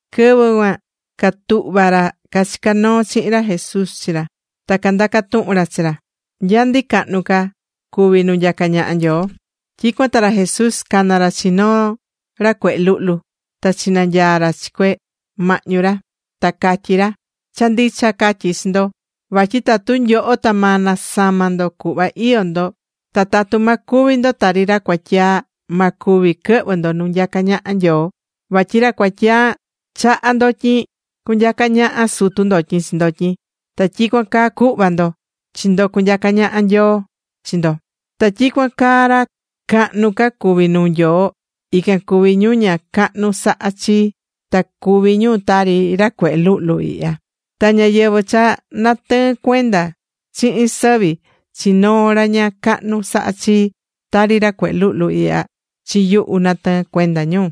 Quɨvɨ cuan catuhva̱ ra cachicá noo chihin ra Jesús chi ra, ta candaca̱ tuhun ra chi ra: ―¿Nya ndi cahnu ca cuví nu nyacá ñaha Nyoo? Tyicuan ta ra Jesús cana̱ ra chi noo ra cuehe luhlu, ta chinanyaa̱ ra chi cue mahñu ra. Ta catyí ra: ―Cha ndicha catyí chi ndo, vatyi tatu nyoho ta ma nasama ndo cuhva iyó ndo, ta tatu ma cuvi ndo tari ra cuatyaa, ma cuvi quɨhvɨ ndo nu nyacá ñaha Nyoo. Vatyi ra cuatyaa chahá ndotyin cunyaca ñaha sutu ndotyin chi ndotyin, ta tyicuan caa cu̱hva ndo chi ndo cunyaca ñaha Nyoo chi ndo. Ta tyicuan caa ra cahnu ca cuví nuu Nyoo, ican cuví ñu ña cahnu sahá chi, ta cuví ñu tari ra cuehe luhlu ihya. Ta ñáyɨvɨ cha natɨɨ́n cuenda chihin sɨvi chi noo ra ña cahnu sahá chi, tari ra cuehe luhlu ihya, chi yuhu natɨɨ́n cuenda ñu.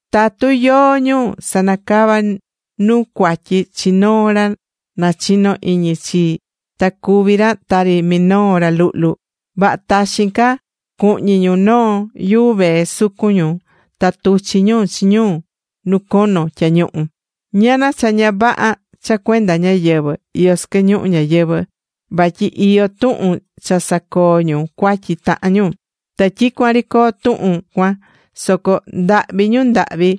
’Tatu yóó ñu sanacavá nu cuatyi chi noo ra nachinó iñi chii ta cuví ra tari minoo ra luhlu, vaha taxin ca, cuhñi ñu noo yuu vee sucun ñu ta tuchi ñu chi ñu nu cono tyañuhu. ¡Ñana cha ña vaha cha cuenda ñáyɨvɨ iyó sɨquɨ ñuhu ñayɨvɨ, vatyi iyó tuhun cha sacoo ñu cuatyi tahan ñu! Ta tyicuan ri coo tuhun cuan, soco ¡ndahvi ñu ndahvi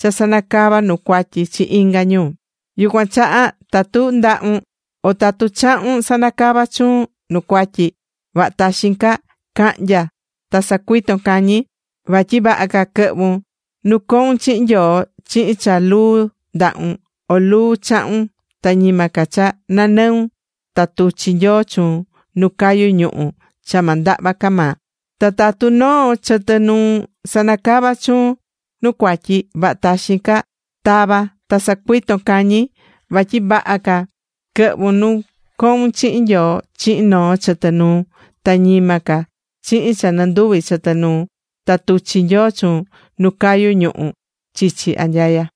cha sanacava nu cuatyi chi inga ñu! ’Yucuan chaha tatu ndahun o tatu chahun sanacava chuun nu cuatyi, vaha taxin ca ca̱hnya ta sa̱cuiton cañi. Vatyi vaha ca quɨhvun nu coun chihin Nyoo chihin cha luu ndahun o luu chahun, ta ñima ca cha nanɨun ta tuchi Nyoo chuun nu cayú ñuhu̱ cha ma ndahva ca maa. Ta tatu noo chɨtɨ nuun sanacavá chuun nu cuatyi, vaha taxin ca ta̱va ta sa̱cuiton cañi. Vatyi vaha ca quɨhvun nu coun chihin Nyoo chihin noo chɨtɨ nuun, ta ñima ca chihin cha nɨnduvi chɨtɨ nuun ta tuchi Nyoo chuun nu cayú ñuhu̱ chichi anyaya.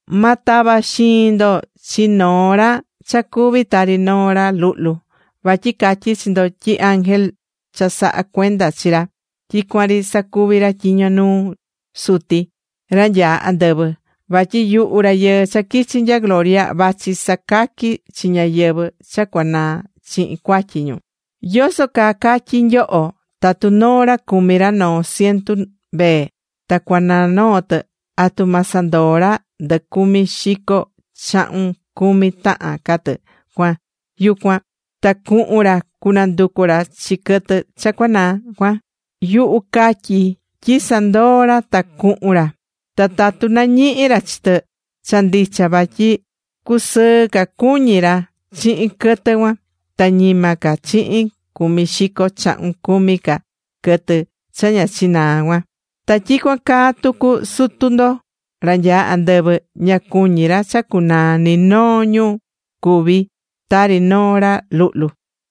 ’Ma tava xiin ndo chi ni noo ra cha cuví tari noo ra luhlu, vatyi catyí chi ndo tyi ángel cha sahá cuenda chi ra, tyicuan ri sacuví ra tyiño nuu Suti, ra nyaá andɨvɨ. Vatyi yuhu Rayɨɨ cha quichi̱ nya gloria, vachi sacaqui chi ñáyɨvɨ cha cuanaa chihin cuatyi ñu. ¿Yoso caa catyi nyoho? Tatu noo ra cumí ra noo cientu mbee, ta cuanaa noo tɨ, ¿atu ma sandoo ra ndɨ cumi xico chahun cumi tahan ca tɨ cuan yucu cuan, ta cuhun ra cunanducu ra chi quɨtɨ cha cuanaa cuan? Yuhu catyí tyi sandoo ra ta cuhun ra. Ta tatu nañihi ra chi tɨ, cha ndicha vatyi cusɨɨ ca cuñí ra chihin quɨtɨ cuan, ta ñima ca chihin cumi xico chahun cumi ca quɨtɨ cha ña chinaa̱ cuan. Ta tyicuan caa tucu, Sutu ndo ra nyaá andɨvɨ ña cuñí ra cha cunaa ni noo ñu cuví tari noo ra luhlu.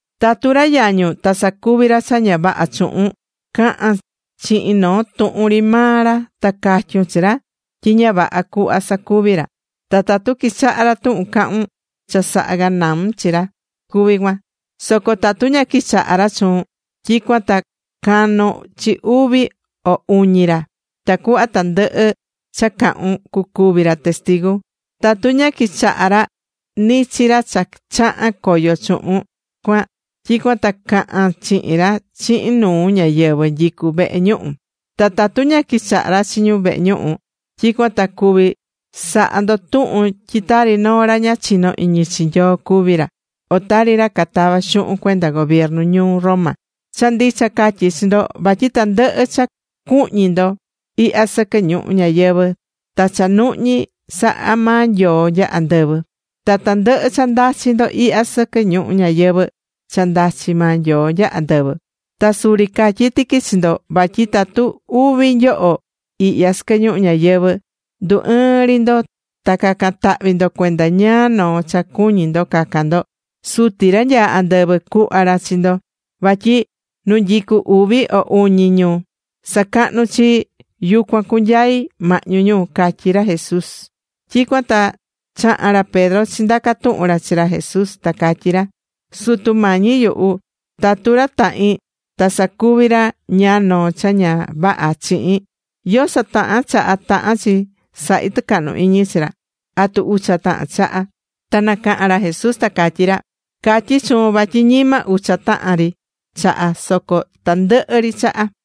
’Tatu ra yañun ta sacuvi̱ ra cha ña vaha chuhun, ca̱han chihin noo tuhun ri maa ra ta ca̱tyun chi ra tyi ña vaha cuhva sacuvi̱ ra. Ta tatu quichaha ra tuhun cahún, cha saha̱ ganaun chi ra cuví cuan. Soco tatu ña quichahá ra chuun, tyicuan ta ca̱non chi uvi o uñi ra, tacuhva tandɨhɨ cha cahun cucuvi ra testigu. Tatu ña quichaha̱ ra ni chi ra cha chaha̱n coyo chuhun cuan, tyicuan ta ca̱han chihin ra chihin nuu ñáyɨvɨ nyicú vehe ñuhu. Ta tatu ña quichaha ra chi ñu vehe ñuhu, tyicuan ta cuví saha ndo tuhun tyi tari noo ra ña chinó iñi chi Nyoo cuví ra, o tari ra catavá xuhun cuenda gobiernu ñuu Roma. ’Cha ndicha catyí chi ndo, vatyi tandɨhɨ cha cuhñi ndo ihya sɨquɨ ñuhu ñayɨvɨ̱, ta cha nuhñi saha̱ maa Nyoo nya andɨvɨ. Ta tandɨhɨ cha ndachi ndo ihya sɨquɨ ñuhu ñayɨvɨ̱, cha ndachi maa Nyoo nya andɨvɨ. ’Ta suri catyí tiqui chi ndo, vatyi tatu uvi nyoho ihya sɨquɨ ñuhu ñayɨvɨ̱, ndu ɨɨn ri ndo ta cacan tahvi ndo cuenda ñáá noo cha cuñí ndo cacan ndo, Suti, ra nyaá andɨvɨ cuhva ra chi ndo. Vatyi nu nyicú uvi o uñi ñu sacahnú chii, yucuan cunyai mahñu ñu ―catyí ra Jesús. Tyicuan ta chaha̱n ra Pedro chindaca̱ tuhun ra chi ra Jesús ta catyí ra: ―Sutu Mañi yuhu, tatu ra tahin ta sacuvi ra ñáá noo cha ña vaha chihin, ¿yoso tahan chaha tahán chi sahi tɨcahnu iñi chi ra? ¿Atu ucha tahan chaha? Ta nacaha̱n ra Jesús ta catyí ra: ―Catyí chuun vatyi ñima ucha tahan ri chaha, soco tandɨhɨ ri chaha.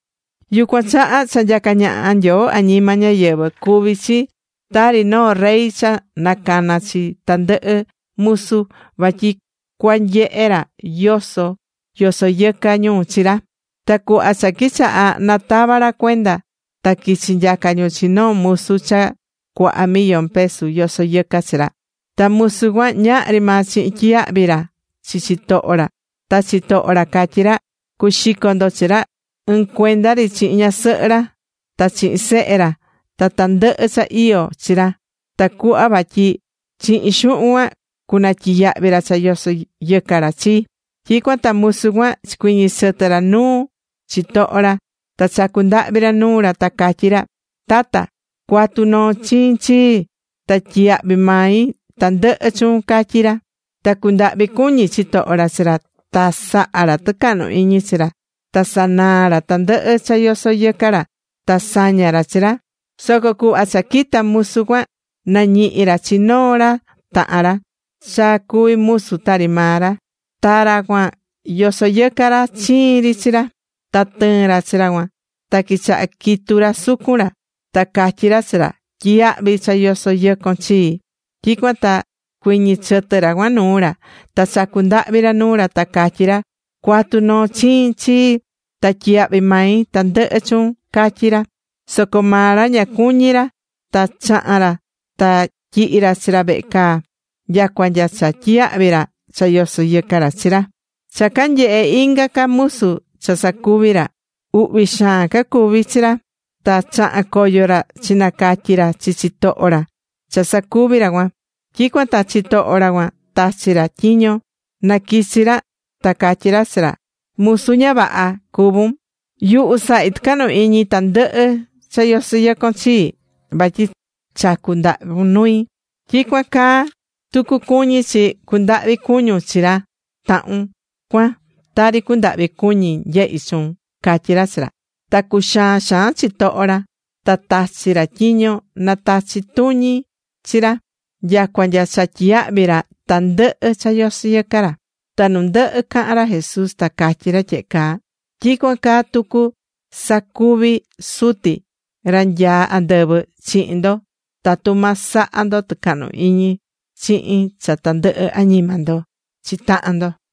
’Yucuan chaha cha nyacá ñaha Nyoo añima ñáyɨvɨ cuví chi tari noo rey cha nacana̱ chi tandɨhɨ musu vatyi cuanyehe ra yoso yosó yɨca ñu chi ra. Ta cuhva cha quichaha̱ natava ra cuenda, ta quichi̱ nyaca ñu chi noo musu cha cuaha millón pesu yosó yɨca chi ra. Ta musu cuan ñahri maa chihin tyiyahvi ra chi chitoho ra, ta chitoho ra catyí ra: “Cuaxico ndo chi ra ɨɨn cuenda ri chihin ñasɨhɨ ra, ta chihin sehe ra ta tandɨhɨ cha iyó chi ra tacuhva vatyi chihin xuhun cuan cunatyiyahvi ra cha yosó yɨca ra chii.” Tyicuan ta musu cuan chicuiñi̱ chɨtɨ ra nuu chitoho ra, ta chacu̱ ndahvi ra nuu ra, ta catyí ra: “Tata, cua̱tu noo chiin chii, ta tyiyahvi mai tandɨhɨ chuun”, catyí ra. Ta cundahvi̱ cuñi chitoho ra chi ra, ta saha̱ ra tɨcahnu iñi chi ra, ta sanaa̱ ra tandɨhɨ cha yoso yɨca ra, ta saña̱ ra chi ra. Soco cuhva cha quita̱ musu cuan, nañihi̱ ra chi noo ra tahan ra cha cuví musu tari maa ra. Ta ra cuan yosó yɨca ra chiin ri chi ra. Ta tɨɨ̱n ra chi ra cuan, ta quichaha̱ quitu ra sucun ra, ta catyí ra chi ra: “Tyi̱yahvi cha yosó yɨcon chii.” Tyicuan ta chicuiñi̱ chɨtɨ ra cuan nuu ra, ta chacu̱ ndahvi ra nuu ra ta catyí ra: “Cua̱tu noo chiin chii, ta tyiyahvi mai tandɨhɨ chuun”, catyí ra. Soco maa ra ña cuñi̱ ra, ta chaha̱n ra ta tyihi̱ ra chi ra vehe caa nyacua nya cha tyiyahvi̱ ra cha yoso̱ yɨca ra chi ra. Cha canyehe̱ inga ca musu cha sacuvi̱ ra, uhvi xaan cacuví chi ra, ta chaha̱n coyo ra chinacatyi̱ ra chi chitoho ra cha sacuvi̱ ra cuan. Tyicuan ta chitoho ra cuan tachi̱ ra tyiño na quichi ra ta catyí ra chi ra: “Musu ña vaha cuvún. Yuhu sahi̱ tɨcahnu iñi tandɨhɨ cha yosó yɨcon chii, vatyi chacu̱ ndahvun nui. Tyicuan caa tucu cuñí chi cundahvi cuñun chi ra tahun cuan tari cundahvi̱ cuñi̱ nyehi chuun”, catyí ra chi ra. Ta cuxaa̱n xaan chitoho ra, ta tachi̱ ra tyiño na tachi tuñi ñu chi ra, nyacua nya cha tyiyahvi ra tandɨhɨ cha yosó yɨca ra. Ta nu ndɨhɨ caha̱n ra Jesús, ta catyí ra tyehe caa: ―Tyicuan caa tucu cusacuvi Suti, ra nyaá andɨvɨ, chihin ndo tatu ma saha ndo tɨcahnu iñi chihin cha tandɨhɨ añima ndo chi tahan ndo.